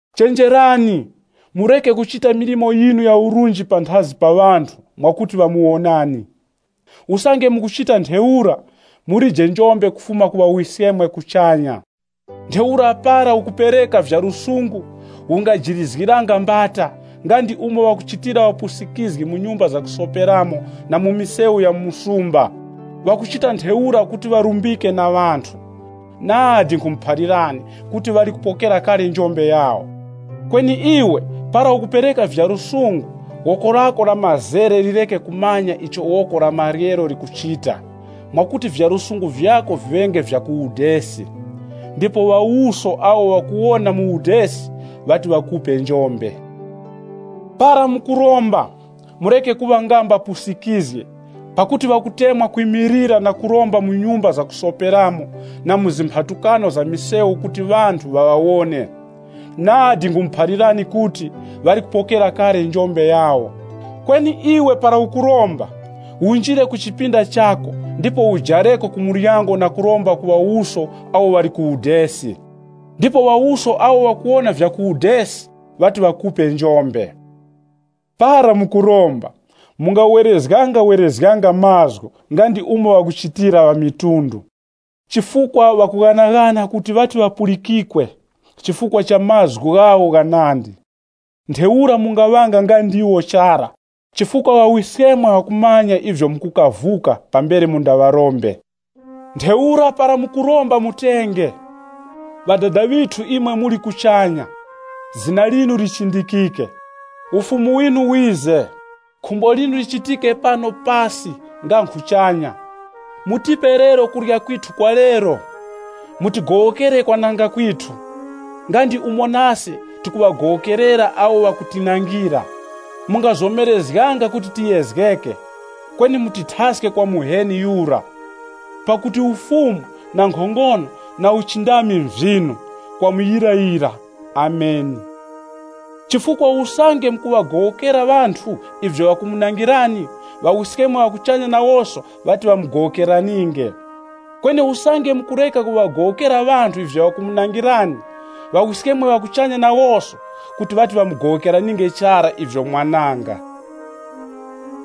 “Chenjerani, mureke kuchita milimo yinu ya urunji panthazi pa ŵanthu mwakuti ŵamuwonani. Usange mukuchita ntheura, mulije njombe kufuma ku Ŵawiskemwe ŵa kuchanya. “Ntheura para ukupereka vya lusungu ungajirizgiranga mbata, nga ndi umo ŵakuchitira ŵapusikizgi mu nyumba zakusoperamo na mu misewu ya mu msumba. Ŵakuchita ntheura kuti ŵarumbike na ŵanthu. Nadi nkhumuphalirani kuti ŵali kupokera kale njombe yawo. Kweni iwe, para ukupereka vya lusungu, woko lako la mazere lireke kumanya icho woko la maryero likuchita, mwakuti vya lusungu vyako viŵenge vya ku udesi. Ndipo Ŵawuso awo ŵakuwona mu udesi, ŵati ŵakupe njombe. “Para mukuromba, mureke kuŵa nga mbapusikizgi, pakuti ŵakutemwa kwimilira na kuromba mu nyumba zakusoperamo na mu zimphatukano za misewu kuti ŵanthu ŵaŵawone. Nadi nkhumuphalirani kuti, ŵali kupokera kale njombe yawo. Kweni iwe para ukuromba, unjire ku chipinda chako ndipo ujareko ku muryango na kuromba ku Ŵawuso awo ŵali ku udesi. Ndipo Ŵawuso awo ŵakuwona vya ku udesi, ŵati ŵakupe njombe. “Para mukuromba, mungawerezgangawerezganga mazgu nga ndi umo ŵakuchitira ŵamitundu. Chifukwa ŵakughanaghana kuti ŵati ŵapulikikwe chifukwa cha mazgu ghawo ghanandi. Ntheura mungaŵanga nga ndiwo chara, chifukwa Ŵawiskemwe ŵakumanya ivyo mukukavuka pambere mundaŵarombe. Ntheura para mukuromba mutenge: ‘Ŵadada ŵithu imwe muli kuchanya, zina linu lichindikike. Ufumu winu wize, khumbo linu lichitike pano pasi nga nkhuchanya. Mutipe lero kurya kwithu kwa lero, Mutigowokere ise kwananga kwithu, nga ndi umo nase tikuŵagowokerera awo ŵakutinangira. Mungatitoreranga mu kuyezgeka, kweni mutithaske kwa Muheni yura.’ [Pakuti ufumu, nkhongono, na uchindami nvyinu kwa muyirayira. Ameni.] “Chifukwa usange mukuŵagowokera ŵanthu ivyo ŵakumunangirani, Ŵawiskemwe ŵa kuchanya nawoso ŵati ŵamugowokeraninge. Kweni usange mukureka kuŵagowokera ŵanthu ivyo ŵakumunangirani, Ŵawiskemwe ŵa kuchanya nawoso, kuti ŵati ŵamugowokeraninge chara ivyo mwananga.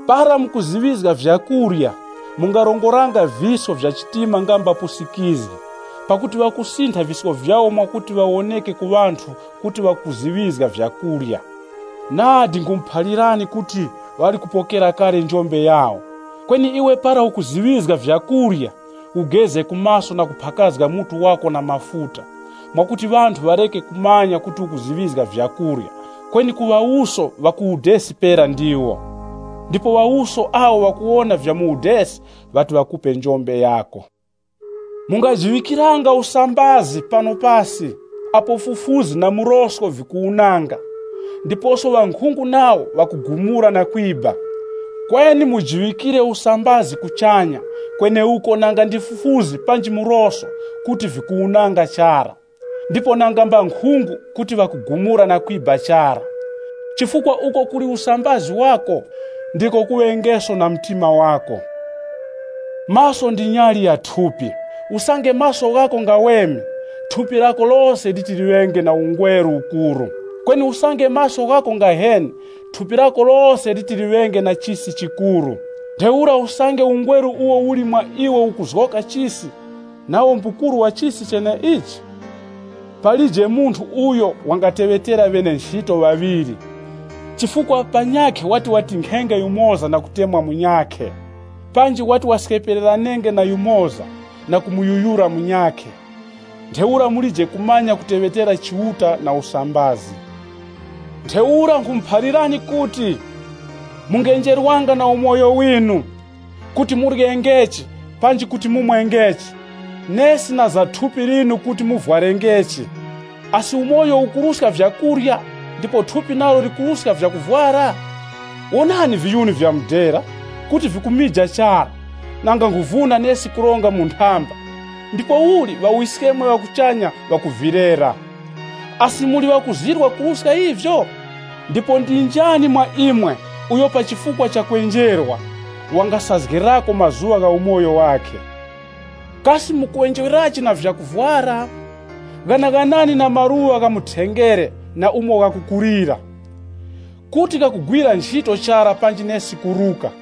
“Para mukuziŵizga vyakurya, mungarongoranga visko vya chitima nga mbapusikizgi, pakuti ŵakusintha visko vyawo mwakuti ŵawoneke ku ŵanthu kuti ŵakuziŵizga vyakurya. Nadi nkhumuphalirani kuti ŵali kupokera kale njombe yawo. Kweni iwe para ukuziŵizga vyakurya, ugeze ku maso na kuphakazga mutu wako na mafuta, mwakuti ŵanthu ŵareke kumanya kuti ukuziŵizga vyakurya, kweni ku Ŵawuso ŵa ku udesi pera ndiwo. Ndipo Ŵawuso awo ŵakuwona vya mu udesi, ŵati ŵakupe njombe yako. “Mungajiŵikiranga usambazi pano pasi, apo fufuzi na murosko vikuwunanga, ndiposo ŵankhungu nawo ŵakugumura na kwiba. Kweni mujiŵikire usambazi kuchanya kweneuko nanga ndi fufuzi panji murosko kuti vikuwunanga chara, ndipo nanga mbankhungu kuti ŵakugumura na kwiba chara. Chifukwa uko kuli usambazi wako, ndiko kuŵengeso na mtima wako. “Maso ndi nyali ya thupi. Usange maso ghako ngaweme, thupi lako lose liti liŵenge na ungweru ukuru. Kweni usange maso ghako ngaheni, thupi lako lose liti liŵenge na chisi chikuru. Ntheura usange ungweru uwo uli mwa iwe ukuzgoka chisi, nawo mbukuru wa chisi cheneichi! “Palije munthu uyo wangateŵetera ŵene-nchito ŵaŵiri. Chifukwa panyakhe wati watinkhenge yumoza na kutemwa munyakhe. Panji wati waskepereranenge na yumoza na kumuyuyura munyakhe. Ntheura mulije kumanya kuteŵetera Chiuta na usambazi. “Ntheura nkhumuphalirani kuti, mungenjerwanga na umoyo winu, kuti muryengechi, panji kuti mumwengechi, nesi na za thupi linu kuti muvwarengechi. Asi umoyo ukuruska vyakurya, ndipo thupi nalo likuruska vyakuvwara? Wonani viyuni vya mudera, kuti vikumija chara, nanga nkhuvuna nesi kuronga mu nthamba, ndipouli Ŵawiskemwe ŵa kuchanya ŵakuvilera. Asi muli ŵakuzirwa kuruska ivyo? Ndipo ndi njani mwa imwe uyo pa chifukwa cha kwenjerwa, wangasazgirako mazuŵa ku umoyo wakhe? “Kasi mukwenjerwerachi na vyakuvwara? Ghanaghanani na maluŵa gha mu thengere na umo ghakukulira. Kuti ghakugwira nchito chara panji nesi kuruka.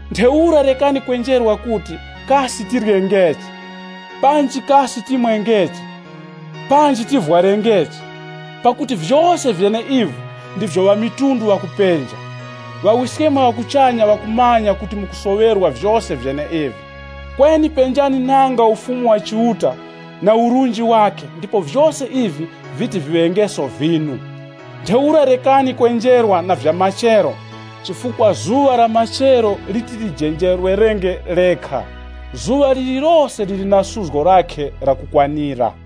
“Ntheura rekani kwenjerwa kuti, ‘Kasi tiryengechi?’ Panji ‘Kasi timwengechi?’ Panji ‘Tivwarengechi?’ Pakuti vyose vyeneivi ndivyo ŵamitundu ŵakupenja. Ŵawiskemwe ŵa kuchanya ŵakumanya kuti mukusoŵerwa vyose vyeneivi. Kweni penjani nanga Ufumu wa Chiuta na urunji wakhe ndipo vyose ivi viti viŵengeso vyinu. Ntheura rekani kwenjerwa na vya na machero chifukwa zuŵa la machero liti lijenjerwerenge lekha. Zuŵa lirilose liri na suzgo lakhe lakukwanira.